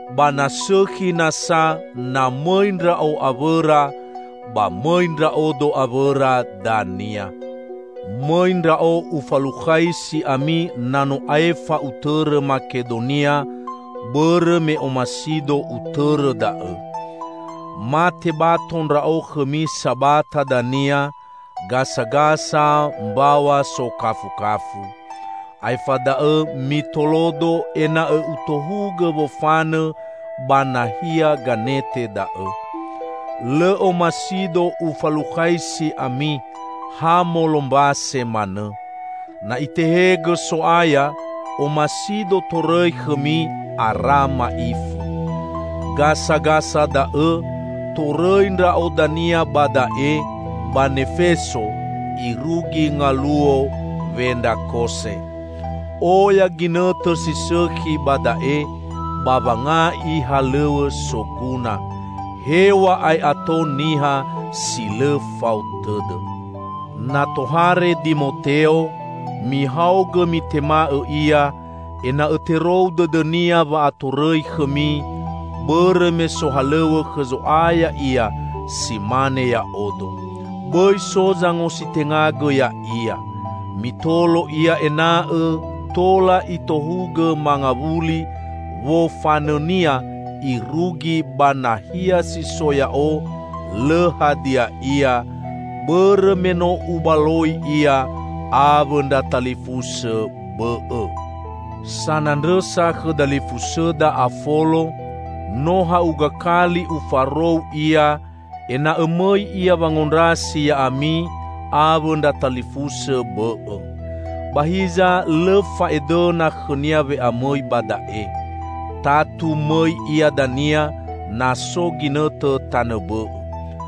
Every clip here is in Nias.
Ba na sõkhi nasa na mõi ndra'o awõra, ba mõi ndra'odo awõra dania. Mõi ndra'o ufalukhaisi ami na no aefa utõrõ Makedonia, bõrõ me omasido utõrõ da'õ. Ma tebato ndra'o khõmi sabata dania, gasagasa mbaw̃a sokafukafu. Aefa da'õ mitolodo ena'õ utohugõ wofanõ ba nahia ganete da'õ. Lõ omasido ufalukhaisi ami ha molombase manõ. Na Itehegõ So'aya, omasido torõi khõmi, ara ma'ifu. Gasagasa da'õ torõi ndra'o dania ba da'e, ba Nefeso, irugi ngaluo Wendrakose. Oya ginõtõ si sõkhi ba da'e ba wanga'i halõw̃õ soguna, hew̃a'ae ato niha si lõ fao tõdõ. Na tohare Dimoteo, mihaogõ mitema'õ ia ena'õ terou dõdõnia wa'atorõi khõmi, bõrõ me sohalõw̃õ khõ Zo'aya ia si mane ya'odo. Bõi so zangositengagõ ya'ia. Mitolo ia ena'õ tola itohugõ mangawuli wofanõnia irugi ba nahia si so ya'o lõ hadia ia, bõrõ me no ubaloi ia awõ ndra talifusõ bõ'õ. Sanandrõsa khõ dalifusõda Afolo, no ha'uga kali ufarou ia ena'õ mõi ia wangondrasi ya'ami awõ ndra talifusõ bõ'õ. Ba hiza lõ fa'edõna khõnia we'amõi ba da'e. Tatu mõi ia dania, na so ginõtõ tanõ bõ'õ.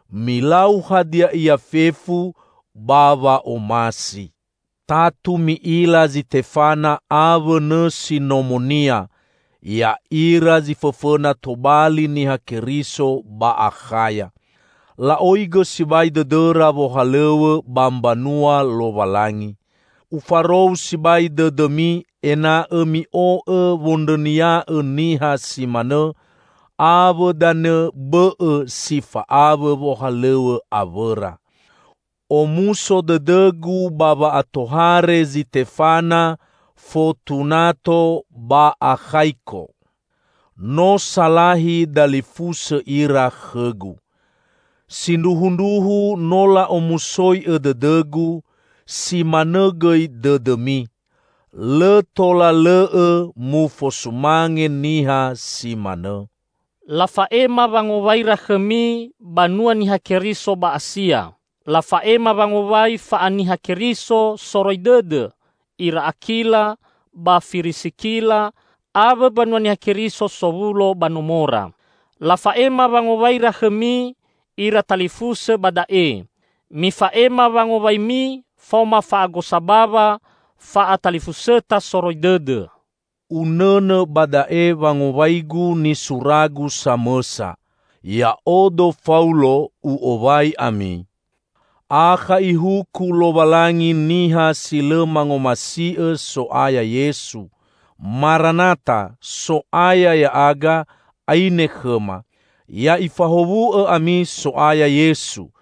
Milau hadia ia fefu ba wa'omasi. Tatu mi'ila Zitefana awõ nõsi nomonia; ya'ira zi fõfõna tobali Niha Keriso ba Akhaya. La'oigõ sibai dõdõra wohalõw̃õ ba mbanua Lowalangi. Ufarou sibai dõdõmi ena'õ mi'o'õ wondrõnia'õ niha si manõ, awõ danõ bõ'õ si fa'awõ wohalõw̃õ awõra. Omuso dõdõgu ba wa'atohare Zitefana, Fotunato ba Akhaiko. No salahi dalifusõ ira khõgu. Sindruhundruhu no la'omusoi'õ dõdõgu, si manõ gõi dõdõmi. Lõ tola lõ'õ mufosumange niha si manõ. Lafa'ema wangowaira khõmi banua Niha Keriso ba Asia. Lafa'ema wangowai fa'aniha Keriso soroi dõdõ ira Akila ba Firisikila awõ mbanua Niha Keriso sowulo ba nomora. Lafa'ema wangowaira khõmi ira talifusõ ba da'e. Mifa'ema wangowaimi faoma fa'agosa bawa fa'atalifusõta soroi dõdõ. Unõnõ ba da'e wangowaigu nisuragu samõsa: Ya'odo Faulo, u'owai ami. Akha Ihuku Lowalangi niha si lõ mangomasi'õ So'aya Yesu! Maranatha -- So'aya ya'aga, aine khõma! Ya'ifahowu'õ ami So'aya Yesu.